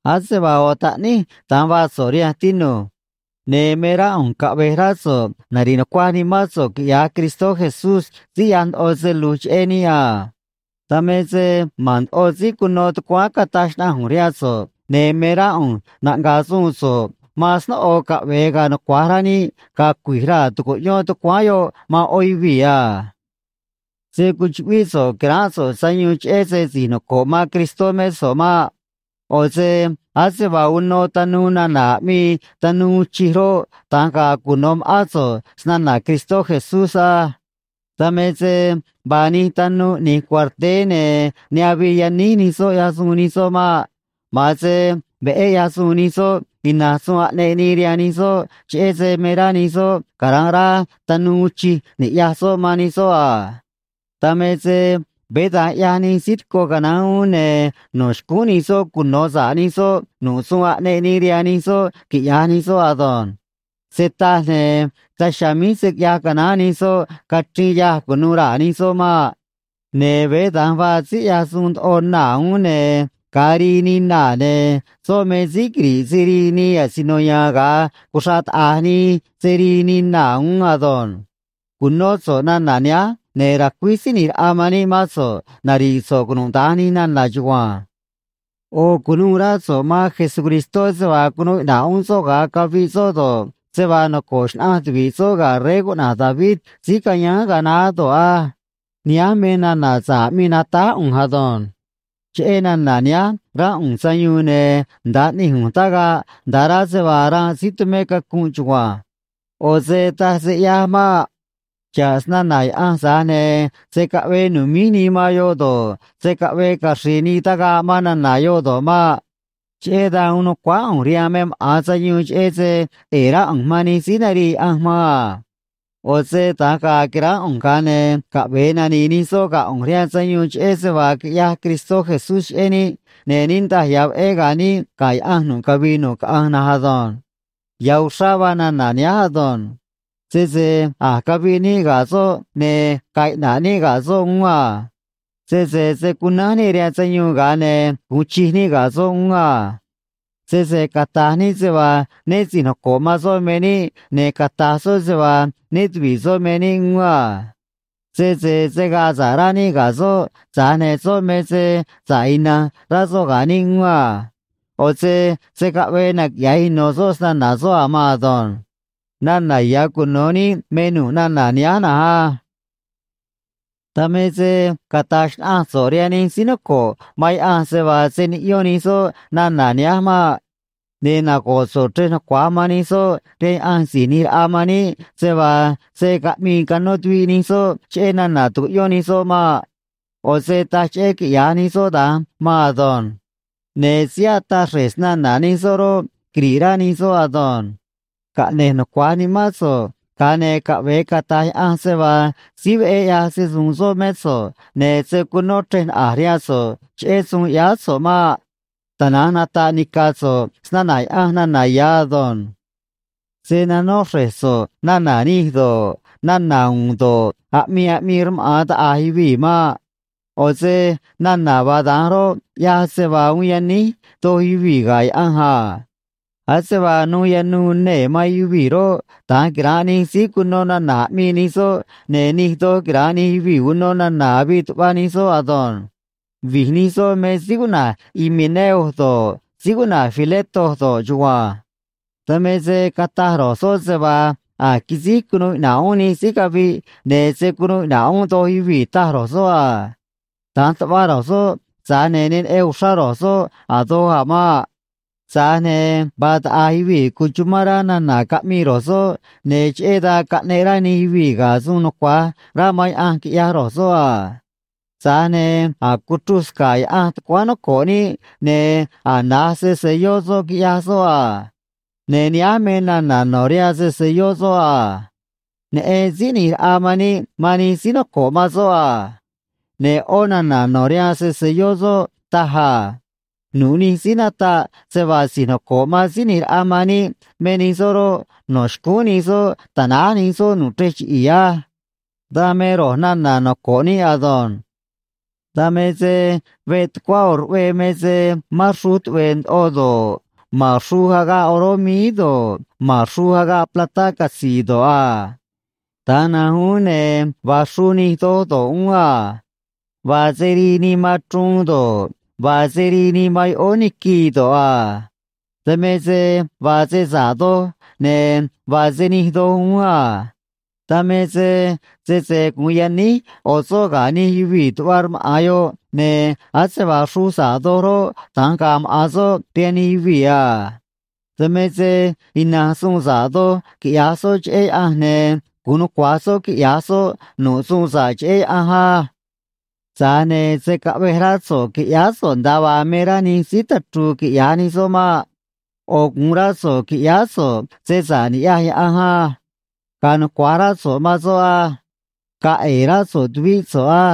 Ase vaa ꞌo̱ taꞌníj, da̱nj vaa so̱ꞌ rihanj, tinu̱j. Ne̱ me rá ꞌu̱nj caꞌve̱j rá so̱ꞌ nari̱ꞌ nucuaj nimán so̱ꞌ, quiꞌya̱j Cristó Jesús síí ꞌyaj ndoꞌo se lu̱j cheꞌé níꞌ a. Dan me se ma̱n ndoꞌo síí cuno tucuáán cataj xnaꞌanj ꞌu̱nj rihaan so̱ꞌ, ne̱ me rá ꞌu̱nj naꞌnga̱a̱ suun so̱ꞌ man snóꞌo caꞌve̱e ga̱a̱ nucua̱j rá níꞌ ga̱a̱ cui̱j raa̱ tu̱cuꞌyón tucuáán yoꞌ man ꞌó yuvii̱ a. Se̱ cuchuꞌvíꞌ so̱ꞌ qui̱ránꞌ so̱ꞌ sayuun cheꞌé se si̱j noco̱ꞌ man Cristó mé so̱ꞌ maꞌ. ꞌO̱ se ase vaa uno tanuu nana̱ aꞌmii tanuu uun chij roꞌ, da̱nj ga̱a̱ cuno̱ ma̱ꞌán so̱ꞌ snana̱ Cristó Jesús á. Dan me se vaa nij tanuu ꞌni̱j cuarteé, ne̱ ne avii yaníj nij soꞌ ꞌyaj suun nij soꞌ maꞌ. Ma̱an se veꞌé ꞌyaj suun nij soꞌ ina̱nj suun aꞌneꞌ nii rihaan nij soꞌ, cheꞌé se me rá nij soꞌ cara̱nꞌ rá tanuu uun chij ni̱ꞌyaj soꞌ man nij soꞌ a. Dan me se veé da̱nj ꞌyaj nij síí tico canaán uún, ne̱ no̱ xcúún nij soꞌ cuno̱ sa̱ꞌ nij soꞌ nu̱ꞌ suun aꞌneꞌ nii rihaan nij soꞌ quiꞌya̱j nij soꞌ ado̱nj. Se taj, ne̱ daj chiha̱a̱ míj se̱ quiꞌyaj canaán nij soꞌ cachriin yâj cu̱nuû raa̱ nij soꞌ maꞌ. Ne̱ veé da̱nj vaa síí ꞌyaj suun ndoꞌo naa̱ uún, ne̱ ga̱a rii nii naa̱, ne̱ soꞌ me síí quiri̱ꞌ se rii nii asino ya̱a̱n ga̱a cuxra̱ꞌ taꞌa̱j nii se rii nii naa̱ uún ado̱nj. Cu̱nó so̱ꞌ nana̱ nihánj, ne̱ ra̱cuíj Síí ꞌNi̱j Raꞌa man níꞌ mán so̱ꞌ nari̱ꞌ so̱ꞌ cunuda̱nj nij nana̱ chugua̱nj. ꞌO̱ cu̱nuû rá so̱ꞌ man Jesucristó se vaa cunuu iꞌna̱ꞌ uún soꞌ ga̱a caviꞌ soꞌ do̱ꞌ, se vaa noco̱ꞌ xnaꞌanj tuvi̱ꞌ soꞌ ga̱ rey cuꞌna̱j David síí cayáán ga̱a naá do̱ꞌ á. Nihánj me nana̱ sa̱ꞌ aꞌmii natáj ꞌu̱nj ado̱nj. Cheꞌé nana̱ nihánj ránꞌ ꞌu̱nj sayuun, ne̱ nda̱a ꞌni̱j ꞌu̱nj tagaꞌ, nda̱ꞌ rá se vaa ranꞌ síí tumé cacunꞌ chugua̱nj. ꞌO̱ se taj se ꞌyaj maꞌ. Xa̱ꞌ snana̱ Yaꞌanj, tza̱j ne̱ se̱ caꞌvee nu̱míj nii man yoꞌ do̱ꞌ, se̱ caꞌvee caxri̱i̱ nii tagaꞌ man nana̱ yoꞌ do̱ꞌ maꞌ. Cheꞌé dan uun nu̱cuáá ꞌu̱nj rihaan me maꞌa̱n sayuun cheꞌé se ꞌe̱e̱ rá ꞌu̱nj man nij síí narii Yaꞌanj man a. ꞌO̱ se da̱nj ga̱a̱ qui̱ránꞌ ꞌu̱nj, ga̱a ne̱ caꞌve̱e nani̱i̱ nij soꞌ ga̱ ꞌu̱nj rihaan sayuun cheꞌé se vaa quiꞌyaj Cristó Jesús cheꞌé níꞌ, ne̱ niꞌndaj ya̱ veꞌé ga̱a̱ níꞌ ga̱ Yaꞌanj nu̱ꞌ cavii nu̱ꞌ caꞌanj na̱nj ado̱nj. Ya̱ uxrá vaa nana̱ nihánj ado̱nj: Sese a̱j caviꞌ níꞌ ga̱ soꞌ, ne̱ ga̱a̱ iꞌna̱ꞌ níꞌ ga̱ soꞌ uún a. Sese se̱ cunánj níꞌ rihaan sayuun, ga̱a ne̱ gu̱un chij níꞌ ga̱ soꞌ uún a. Sese cata̱j níꞌ se vaa né si̱j noco̱ꞌ man soꞌ me níꞌ, ne̱ cata̱j soꞌ se vaa né tuvi̱ꞌ soꞌ me níꞌ uún a. Sese se̱ gaa sa̱ꞌ rá níꞌ ga̱ soꞌ, tza̱j ne̱ soꞌ me se sa̱ꞌ ina̱nj rá soꞌ ga̱ níꞌ uún a. ꞌO̱ se se̱ caꞌvee naquiꞌya̱j ino̱ soꞌ snana̱ soꞌ a̱ maan ado̱nj. Nana̱ ya̱ cuno̱ níꞌ me nu̱ꞌ nana̱ nihánj na̱nj á. Dan me se cata̱j xnaꞌanj so̱ꞌ rihaan nij síí noco̱ꞌ man Yaꞌanj se vaa se̱ niꞌyón nij soꞌ nana̱ nihánj maꞌ. Ne̱ nago̱ꞌ so̱ꞌ chrej nucua̱j man nij soꞌ rihaan Yaꞌanj Si̱j ꞌNi̱j Raꞌa man níꞌ se vaa se̱ caꞌmii cano̱ tuviꞌ nij soꞌ cheꞌé nana̱ tucuꞌyón nij soꞌ maꞌ. ꞌO̱ se taj cheꞌé quiꞌya̱j nij soꞌ da̱nj maan ado̱nj. Ne̱ síí ataꞌ xre̱j snana̱ nij soꞌ roꞌ, quiri̱ꞌ rá nij soꞌ ado̱nj. Caꞌne̱j nucua̱j nimán so̱ꞌ, ga̱a ne̱ caꞌve̱e cata̱j Yaꞌanj se vaa síí veꞌé ꞌyaj se‑su̱u̱n soꞌ mé so̱ꞌ, ne̱ se̱ cunó chrej naꞌa̱j rihaan so̱ꞌ cheꞌé suun ꞌyáá so̱ꞌ maꞌ. Tana̱nj nata̱ꞌ nica̱ so̱ꞌ snana̱ Yaꞌanj nana̱ ya̱ ado̱nj. Se̱ nanó xre̱j so̱ꞌ nana̱ nij do̱ꞌ, nana̱ u̱u̱n do̱ꞌ, aꞌmii aꞌmii rmaꞌa̱n taꞌa̱j yuvii̱ maꞌ. ꞌO̱ se nana̱ vaa da̱nj roꞌ ꞌyaj se vaa uun yaníj doj yuvii̱ ga̱ Yaꞌanj a. Ase vaa nuu yanuu nee̱ man yuvii̱ roꞌ, da̱nj quira̱nꞌ nij síí cuno nana̱ aꞌmii nij soꞌ, ne̱ nij doj quira̱nꞌ nij yuvii̱ uno nana̱ avii tuꞌva nij soꞌ ado̱nj. Vi̱j nij soꞌ me síí cuꞌna̱j Himeneo do̱ꞌ, síí cuꞌna̱j Fileto do̱ꞌ chugua̱nj. Dan me se cataj ro̱j soꞌ se vaa a̱j quisíj cunuu iꞌna̱ꞌ uún nij síí caviꞌ, ne̱ se̱ cunuu iꞌna̱ꞌ uún doj yuvii̱, taj ro̱j soꞌ a. Da̱nj tuꞌva ro̱j soꞌ, tza̱j ne̱ ne neꞌen uxrá ro̱j soꞌ a̱ doj a̱ maꞌ. Tza̱j ne̱ vaa taꞌa̱j yuvii̱ cuchumán rá nana̱ caꞌmii ro̱j soꞌ, ne̱ cheꞌé dan caꞌneꞌ rá nij yuvii̱ ga̱ suun nucua̱j rá man Yaꞌanj, quiꞌyaj ro̱j soꞌ a. Tza̱j ne̱ a̱j cuchruj sca̱ꞌ Yaꞌanj tucuáán noco̱ꞌ níꞌ, ne̱ a̱j na̱j se‑se̱lló soꞌ, quiꞌyaj soꞌ a. Ne̱ nihánj me nana̱ no̱ rihaan se‑se̱lló soꞌ a: “Neꞌen Síí ꞌNi̱j Raꞌa man níꞌ man nij síí noco̱ꞌ man soꞌ a.” Ne̱ ꞌó nana̱ no̱ rihaan se‑se̱lló soꞌ taj a: “Nu̱ꞌ nij síí nataꞌ se vaa si̱j noco̱ꞌ man Síí ꞌNi̱j Raꞌa man níꞌ me nij soꞌ roꞌ, no̱ xcúún nij soꞌ ta̱náj nij soꞌ nu̱ꞌ chrej chiꞌi̱i̱ á.” Dan me ro̱j nana̱ noco̱ꞌ níꞌ ado̱nj. Dan me se veꞌ tucuá ꞌo̱ ruꞌvee me se mán xruj tuꞌve̱e̱ ndoꞌo do̱ꞌ, ma̱n xruj agaꞌ oró míí do̱ꞌ, ma̱n xruj agaꞌ platá catzi̱i̱ do̱ꞌ a. Da̱nj na̱nj uún, ne̱ vaa xruj nij doj do̱ꞌ uún a. Vaa se rii nii man chruun do̱ꞌ, vaa se rii nii man yoꞌóó niquii do̱ꞌ a. Dan me se vaa se sa̱ꞌ doj, ne̱ vaa se nij doj uún a. Dan me se sese gu̱un yaníj ꞌo̱ soꞌ ga̱ nij yuvii̱ tuꞌva rmaꞌa̱n yoꞌ, ne̱ ase vaa xruj sa̱ꞌ doj roꞌ, da̱nj ga̱a̱ maꞌa̱n soꞌ rihaan nij yuvii̱ a. Dan me se ina̱nj suun sa̱ꞌ doj quiꞌya̱j soꞌ cheꞌé Yaꞌanj, ne̱ gu̱un nucua̱j soꞌ quiꞌya̱j soꞌ nu̱ꞌ suun sa̱ꞌ cheꞌé Yaꞌanj á. Tza̱j ne̱ se̱ caꞌvej rá so̱ꞌ qui̱ꞌyáá so̱ꞌ nda̱a vaa me rá nij síí tachru̱u̱ quiꞌya̱j nij soꞌ maꞌ. ꞌO̱ gu̱un rá so̱ꞌ qui̱ꞌyáá so̱ꞌ se sa̱ꞌ ni̱ꞌyaj Yaꞌanj á. Ga̱a̱ nucua̱j rá so̱ꞌ man soꞌ á. Ga̱a̱ ꞌe̱e̱ rá so̱ꞌ tuvíꞌ so̱ꞌ á.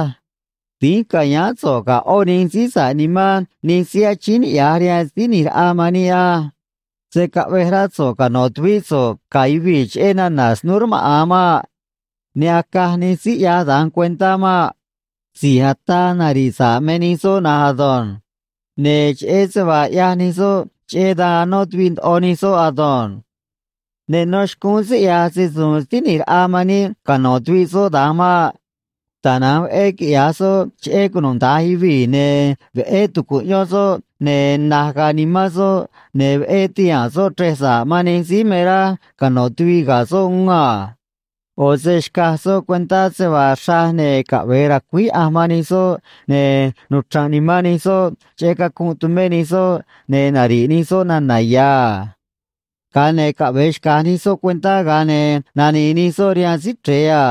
Dínj ca̱yáán so̱ꞌ ga̱ ꞌó nij síí sa̱ꞌ nimán nij síí achíín niꞌya̱j rihaan Síí ꞌNi̱j Raꞌa man níꞌ á. Se̱ caꞌvej rá so̱ꞌ cano̱ tuvíꞌ so̱ꞌ ga̱ yuvii̱ cheꞌé nana̱ snúú rmaꞌa̱n maꞌ. Ne acaj nij síí ꞌyaj da̱nj cuentá maꞌ. Si̱j ataa nari̱ꞌ sa̱ꞌ me nij soꞌ na̱nj ado̱nj. Ne̱ cheꞌé se vaa ꞌyaj nij soꞌ, cheꞌé dan anó tuviꞌ ndoꞌo nij soꞌ ado̱nj. Ne nó xcúún síí ꞌyaj se‑su̱u̱n Síí ꞌNi̱j Raꞌa man níꞌ cano̱ tuviꞌ soꞌ da̱nj maꞌ. Tana̱nj veꞌé quiꞌya̱j soꞌ cheꞌé cunuda̱nj yuvii̱, ne̱ veꞌé tu̱cuꞌyón soꞌ, ne̱ na̱j ga̱a̱ nimán soꞌ, ne̱ veꞌé ti̱haa̱n soꞌ chrej sa̱ꞌ man nij síí me rá cano̱ tuviꞌ ga̱ soꞌ uún a. ꞌO̱ se xcaj soꞌ cuentá se vaa xraj ne̱ caꞌve̱e ra̱cuíj Yaꞌanj man nij soꞌ, ne̱ nuchra̱nꞌ nimán nij soꞌ cheꞌé cacunꞌ tumé nij soꞌ, ne̱ nari̱ꞌ nij soꞌ nana̱ ya̱ a. Ga̱a ne̱ caꞌve̱e xca̱j nij soꞌ cuentá, ga̱a ne̱ nani̱i̱ nij soꞌ rihaan Síí Chre̱e a.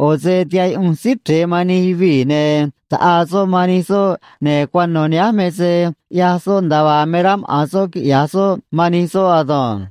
ꞌO̱ se tihaꞌ yuꞌunj Síí Chre̱e man nij yuvii̱, ne̱ taꞌaa soꞌ man nij soꞌ, ne̱ cuano̱ nihánj me se ꞌyaj soꞌ nda̱a vaa me rá maꞌa̱n soꞌ quiꞌya̱j soꞌ man nij soꞌ ado̱nj.